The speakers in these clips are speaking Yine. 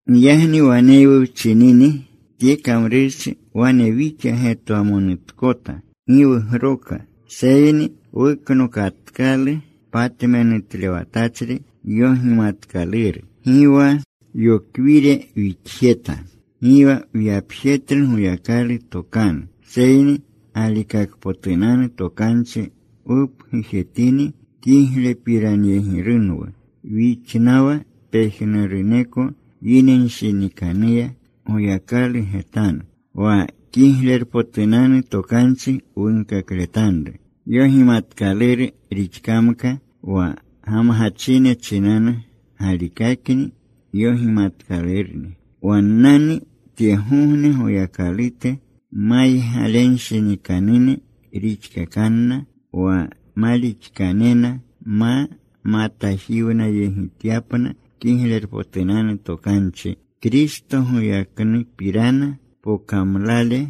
Giyagni waneywu wchinini tye kamrurchi, wane wixa getwamonutkota, gi wugroka. Seyni wuknokatkalu patmenutlewatachri yogimatkaluru. Gi wa yokwiri wixjeta. Gi wa wyapjetlu Goyakalu tokanu. Seyni galikakpotunanu tokanchi wupgujetini, kiglepiranyegirunwu wixnawa pejnuruneko yinenshinikanuya Goyakalu getanu. Wa kiglerpotunanu Tokanchi wunkakletanru yogimatkaluru rixkamka, wa gamgachine chinanu galikakni yogimatkalurni. Wannani tyegogne goyakalute maygalenshinikanune rixkakanna wa malixkanena, ma matajiwnayegityapna Kiglerpotunanu Tokanchi, Kristo goyaknupirana pokamlale.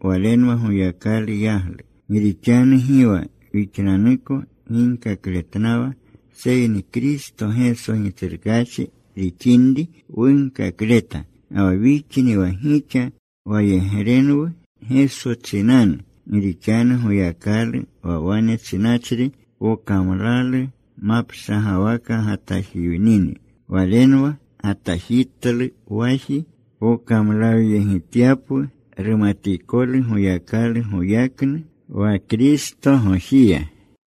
Walenwa Goyakalu yaglu. Gi rixanu gi wa wixnanuko ginkakletnawa, seyni Kristo Geso Gitsrukaachi rixinri wunkakleta ga wa wixni wa gixa wayegrenwu Geso chinanu. Gi rixanu Goyakalu wa wane chinachri, “Pokamlalu mapshagawaka gatajiwnini,” Walenwa gatajitlu waji, pokamlawyegityapwu rumatikolu Goyakalu goyaknu wa Kristogojiya.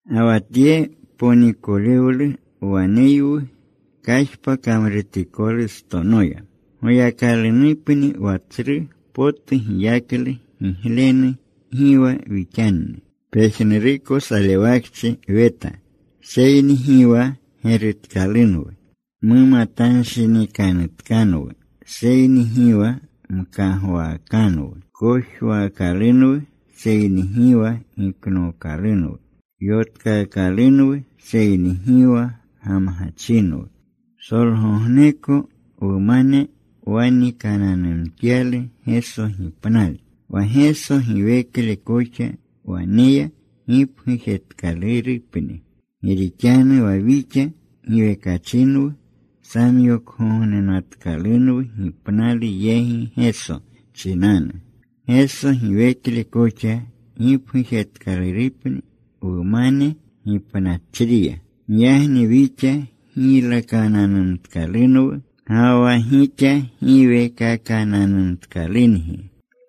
Ga wa tye ponikolewlu waneywu kajpa kamrutikolustonoya, Goyakalunupni wa tsru potu giyaklu giglenu, gi wa wixanni. Pejnuruko salewakchi weta, seyni gi wa gerutkalunwu. Mumatanshinikanutkanwu seyni gi wa mkagwaakanwu. Kojwaakalunwu, seyni gi wa giknookalunwu. Yotkaakalunwu seyni gi wa gamgachinwu. Psolgogneko wumane wanikananumtyalu Geso gipnale, wa Geso giwekle koxa wumaneya gipgujetkalurupni. Gi rixanu wa wixa giwekachinwu samyokgognenatkalunwu gipnalu yegi Geso chinanu, Geso giwekle koxa gipgujetkalurupni wumane gipnachriya. Giyagni wixa giylakananumtkalunwu, ga wa gixa giwekakananumtkalungi.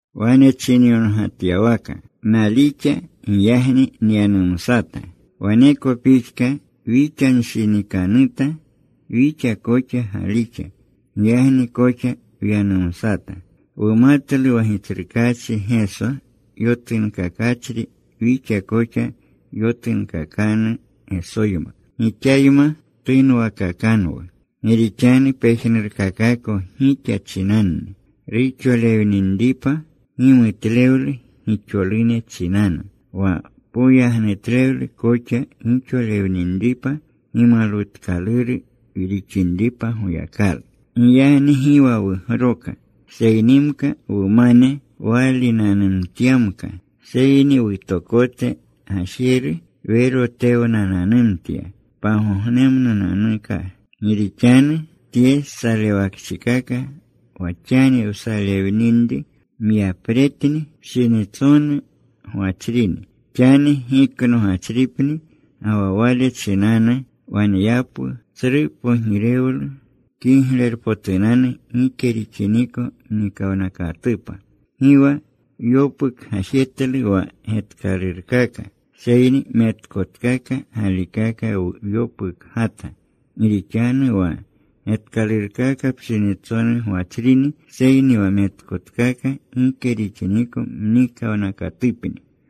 Wane chinyongatyawaka: Nalixa. Giyagni nyanumsata. Waneko pixka wixanshinikanuta. Wixa koxa galixa. Giyagni koxa wyanumsata. Wumatlu wa Gitsrukaachi Geso yotunkakachri, wixa koxa yotunkakanu Gesoyma. Gixayma tunwakakanwu. Gi rixanu pejnurkakako gixa chinanni, ruxolewninripa gimutlewlu gixolune chinanu, wa poyagnutlewlu koxa gixolewninripa, gimalwutkaluru rixinripa Goyakalu. Giyagni gi wa wugroka. Seynimka wumane waalinanumtyamka, seyni wutokote gajeru werotewananumtya pagognemnunanuka. Gi rixanu tye salewakchikaka wa xani wsalewinri myapretni. Pshinitsonu gwachrini. Xani giknogachripni. Ga wa wale chinanu waneyapwu tsru pogirewlu kiglerpotunanu gike rixiniko mnikawnakatupa. Gi wa wyopukgajetlu wa getkalurkaka, seyni metkotkaka galikaka wyopukgata. Gi rixanu wa getkalurkaka pshinitsonu gwachrini. Seyni wa metkotkaka gike rixiniko mnikawnakatupni.